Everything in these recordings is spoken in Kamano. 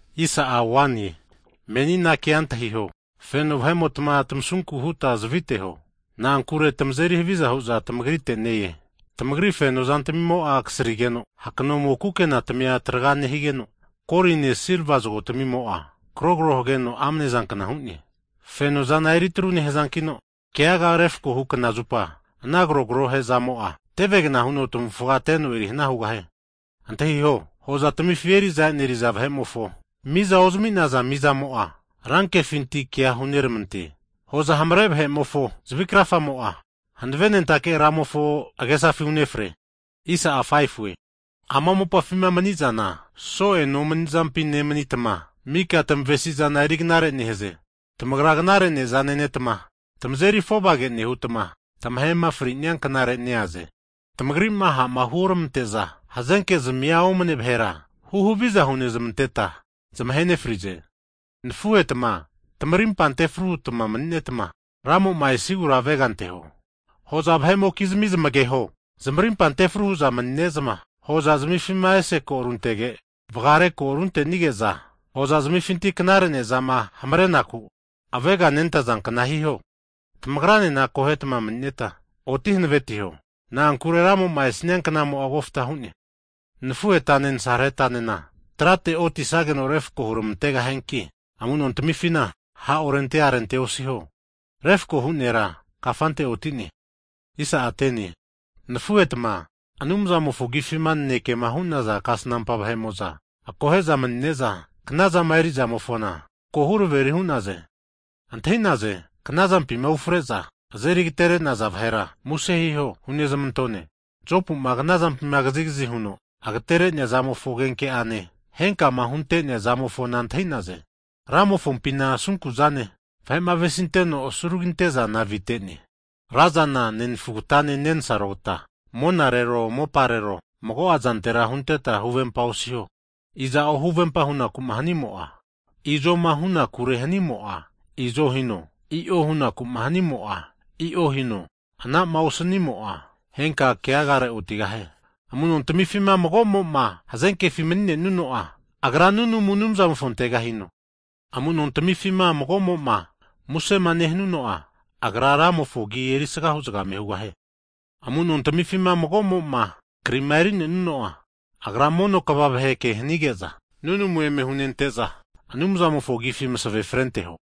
Hagi menina kea antahiho, feno vahe'motma, tamasunku huta zaviteho. Na'ankure tamazeri haviza hu'zana tamagrite ne-e. Tamagri feno zantamimo'a kasrigeno, hakanomo kukenatamia traga nehigeno, goline silva zagotamimo'a krogro heno amnezankna hu'ne. Fenozana eri atru nehazankino, kegaga refkohu knazupa ana krogro he'zamo'a, tevegna huno tamavufga teno erihna hugahie. Antahiho, hozatamifi eri'za eneriza vahe'mofo, mizama ozami'naza mizamo'a ranke huno keaga huneramante. Hoza hamare vahe'mofo zavi krafagemo'a, hanavenentake Ramofo agesafi unefre. Ama mopafima manizana so'e nomanizampi nemanitma, mika tamavesi'zana eriknare nehaze. Tamagra knare neza nenetma tamazeri afovage nehutma, tamahema fri'nianknare neaze. Tamagri'ma ha'ma huoramante'za hazenkezmia omne vahera, huhaviza hunezamanteta zamahe nefrize. Hagi nafuhetma, tamarimpa antefru hutma mani'netma, Ramo'ma esigura avega anteho. Hoza vahe'mokizmi zamageho, zamarimpa antefru hu'za mani'ne'za, hozazamifima ese ko runtege, vagare ko runtenige'za hozazmifinti knare nezama hamarenaku avegama nentazankna hiho. Tamagranena akohetma mani'netma oti hanavetiho, na'ankure Ramo'ma esania knamo'a kofta hu'ne. Nafuhetane nasarahetanena, keaga refkohu trate otisageno refako huramantegahianki amu'nontamifina ha' orente arente osiho. Refako hu nera kafante otine! Nafuhetma, Anumzamofo Agifima nanekema hu'naza kasnampa vahe'mo'za, akohe'za manine'za knazama eri'zamofona ko huraveri'naze. Antahi'naze, knazampima ufre'za azeri agatere'naza vahera muse hiho hunezamantone. Jopu'ma knazampima kazigazi huno agatere'nea zamofo agenke'ane, henka'ama hunte'nea zamofona antahi'naze. Ramofompina asunku'zane, vahe'ma avesinteno asuraginte'zana avite'ne. Razana, nenafugatane nensarogata, monarero moparero mago'azantera huntetma huvempa osiho. Iza'o huvempa hunaku'ma hanimo'a, izoma hunakure hanimo'a, i'zo hino, i'o hunakuma hanimo'a, i'o hino, ana'ma osanimo'a henka keagare otigahie. Hagi amunontamifima magomo'ma hazenkefi mani'nenuno'a, Agra nunamu Anumzamofonte hino. Amu'nontamifima mago'mo'ma musema nehanuno'a, agra Ramofo agi erisagahu zagame hugahie. Amunontamifina mago'mo'ma krima erinenuno'a, Agra mono kva vahe ke hanige'za, nunamu eme hunente'za Anumzamofo agifi masave frenteho.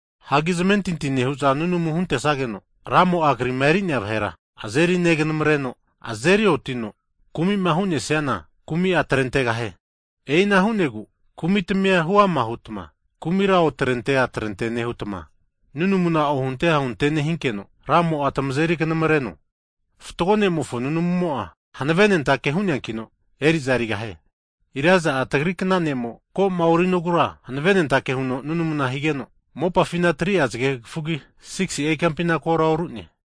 Hagi zamentinti nehu'za nunamu huntesageno, Ramo'a kri'ma eri'nea vahera azeri neganamreno azeri onetino, kumi'ma hunesiana, kumi'a atrentegahie. E'ina hu'negu kumitamia huama hutma kumira otrente atrente nehutma, nunamuna ohunte ahunte nehinkeno, Ramo'a tamazeri kanamareno, fatgo ne'mofo nunamumo'a hanavenentake hu'neankino eri'za erigahie. Elaija'a tagri kna ne'mo, ko'ma orinogura hanavenentake huno nunamuna higeno, mopafina 3'a zagekafugi 6si'a ikampina kora oru'ne.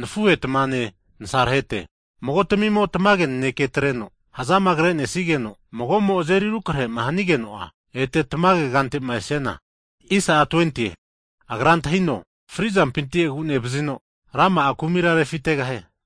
Nafuhetmane nasarahete, mago'tamimo tamage nanekea atreno hazamagrenesigeno, mago'mo azeri rukrehema hanigeno, ete tamage kantema esiana, agra antahino, fri'zampinti agu'nevazino rama'a kumira refitegahie.